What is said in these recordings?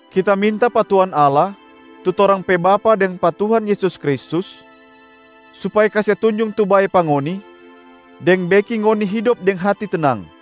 Kita minta pa Tuhan Allah, tu torang pe Bapa deng pa Tuhan Yesus Kristus supaya kase tunjung tu bae pa ngoni deng beking ngoni hidop deng hati tenang.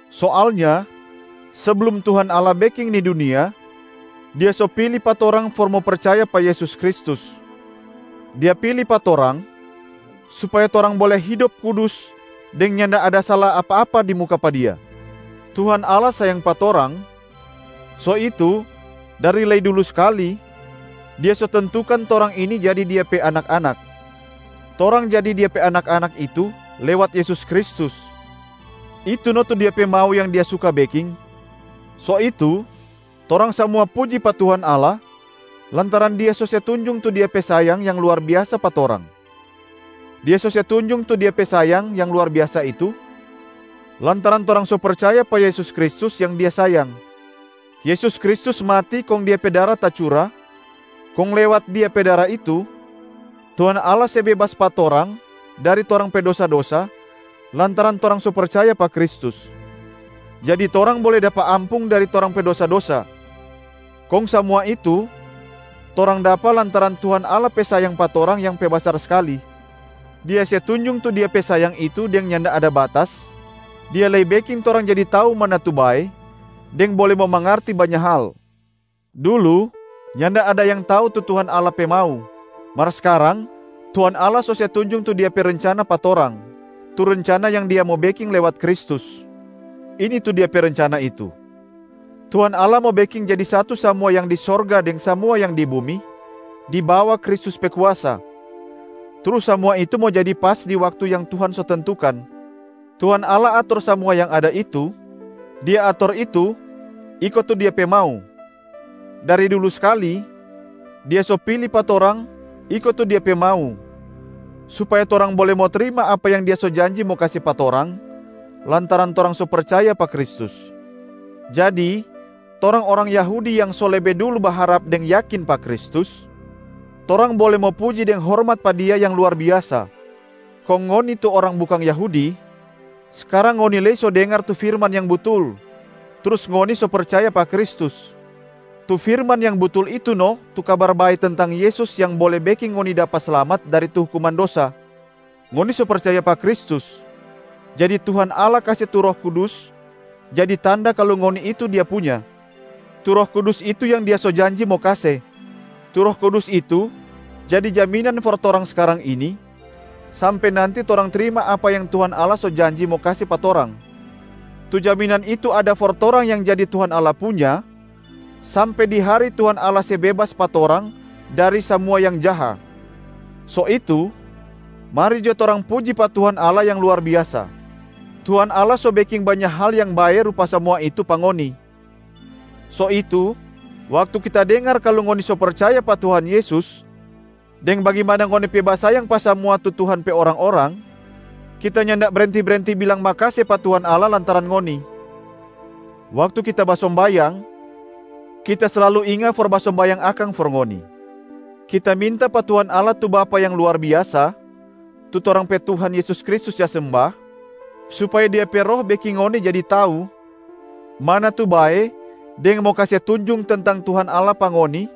Soalnya seblum Tuhan Allah beking ni dunia, Dia so pili pa torang for mo percaya pa Yesus Kristus. Dia pili pa torang supaya torang bole hidop kudus deng nyanda ada sala apa-apa di muka pa Dia. Tuhan Allah sayang pa torang, so itu dari lei dulu skali Dia so tentukan torang ini jadi Dia pe anak-anak. Torang jadi Dia pe anak-anak itu lewat Yesus Kristus, itu no tu Dia pe mau yang Dia suka beking. So itu, torang samua puji pa Tuhan Allah lantaran Dia so se tunjung tu Dia pe sayang yang luar biasa pa torang. Dia so se tunjung tu Dia pe sayang yang luar biasa itu, lantaran torang so percaya pa Yesus Kristus yang Dia sayang. Yesus Kristus mati kong Dia pe dara tacura, kong lewat Dia pe dara itu Tuhan Allah se bebas pa torang dari torang pe dosa-dosa lantaran torang so percaya pa Kristus, jadi torang bole dapa ampung dari torang pe dosa-dosa. Kong samua itu torang dapa lantaran Tuhan Allah pe sayang pa torang yang pe basar skali. Dia se tunjung tu Dia pe sayang itu deng nyanda ada batas, Dia lei beking torang jadi tau mana tu bae deng bole mo mangarti banya hal. Dulu nyanda ada yang tau tu Tuhan Allah pe mau, mar skarang Tuhan Allah so se tunjung tu Dia pe rencana pa torang, tu rencana yang Dia mo beking lewat Kristus. Ini tu Dia pe rencana itu: Tuhan Allah mo beking jadi satu samua yang di sorga deng samua yang di bumi di bawa Kristus pe kuasa, trus samua itu mo jadi pas di waktu yang Tuhan so tentukan. Tuhan Allah ator samua yang ada itu, Dia ator itu iko tu Dia pe mau. Dari dulu skali, Dia so pili pa torang iko tu Dia pe mau, supaya torang bole mo trima apa yang Dia so janji mo kase pa torang lantaran torang so percaya pa Kristus. Jadi torang orang Yahudi yang so lebe dulu baharap deng yakin pa Kristus, torang bole mo puji deng hormat pa Dia yang luar biasa. Kong ngoni tu orang bukang Yahudi, skarang ngoni lei so dengar tu firman yang butul, trus ngoni so percaya pa Kristus. Tu firman yang butul itu no tu Kabar Bae tentang Yesus yang bole beking ngoni dapa slamat dari tu hukuman dosa. Ngoni so percaya pa Kristus, jadi Tuhan Allah kase tu Roh Kudus jadi tanda kalu ngoni itu Dia punya. Tu Roh Kudus itu yang Dia so janji mo kase. Tu Roh Kudus itu jadi jaminan for torang skarang ini sampe nanti torang trima apa yang Tuhan Allah so janji mo kase pa torang. Tu jaminan itu ada for torang yang jadi Tuhan Allah punya sampe di hari Tuhan Allah se bebas pa torang dari samua yang jaha. So itu, mari jo torang puji pa Tuhan Allah yang luar biasa. Tuhan Allah so beking banya hal yang bae rupa samua itu pa ngoni, so itu waktu kita dengar kalu ngoni so percaya pa Tuhan Yesus deng bagimana ngoni pe basayang pa samua tu Tuhan pe orang-orang, kita nyanda brenti-brenti bilang makase pa Tuhan Allah lantaran ngoni. Waktu kita basombayang, kita slalu inga for basombayang akang for ngoni. Kita minta pa Tuhan Allah tu Bapa yang luar biasa, tu torang pe Tuhan Yesus Kristus ja semba, supaya Dia pe Roh beking ngoni jadi tau mana tu bae deng mo kase tunjung tentang Tuhan Allah pa ngoni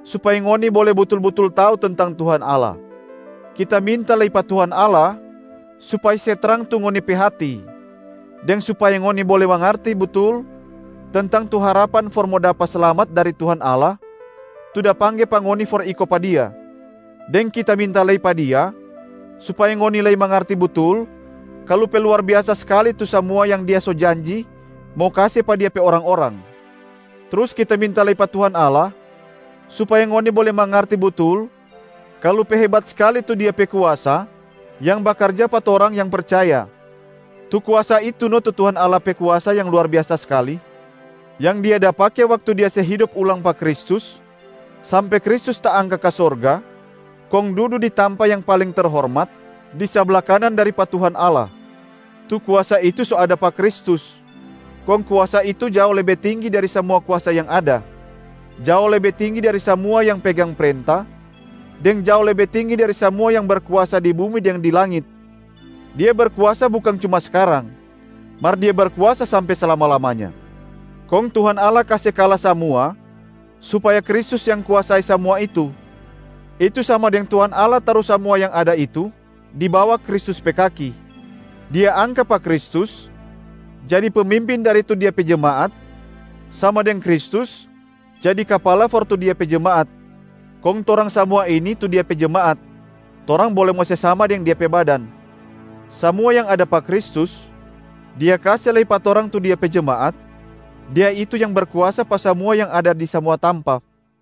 supaya ngoni bole butul-butul tau tentang Tuhan Allah. Kita minta lei pa Tuhan Allah supaya se trang tu ngoni pe hati, deng supaya ngoni bole mangarti butul tentang tu harapan for mo dapa slamat dari Tuhan Allah tu da pangge pa ngoni for iko pa Dia. Deng kita minta lei pa Dia supaya ngoni lei mangarti butul kalu pe luar biasa skali tu samua yang Dia so janji mo kase pa Dia pe orang-orang. Trus kita minta lei pa Tuhan Allah supaya ngoni bole mangarti butul kalu pe hebat skali tu Dia pe kuasa yang bakarja pa torang yang percaya. Tu kuasa itu no tu Tuhan Allah pe kuasa yang luar biasa skali, yang Dia da pake waktu Dia se hidop ulang pa Kristus sampe Kristus taangka ka sorga kong dudu di tampa yang paling terhormat di sabla kanan dari pa Tuhan Allah. Tu kuasa itu so ada pa Kristus, kong kuasa itu jao lebe tinggi dari samua kuasa yang ada, jao lebe tinggi dari samua yang pegang prenta, deng jao lebe tinggi dari samua yang berkuasa di bumi deng di langit. Dia berkuasa bukang cuma skarang, mar Dia berkuasa sampe slama-lamanya. Kong Tuhan Allah kase kala samua supaya Kristus yang kuasai samua itu, itu sama deng Tuhan Allah taru samua yang ada itu di bawa Kristus pe kaki. Dia angka pa Kristus jadi pemimpin dari tu Dia pe jemaat, sama deng Kristus jadi kapala for tu Dia pe jemaat. Kong torang samua ini tu Dia pe jemaat, torang bole mo se sama deng Dia pe badan. Samua yang ada pa Kristus, Dia kase lei pa torang tu Dia pe jemaat, Dia itu yang berkuasa pa samua yang ada di samua tampa.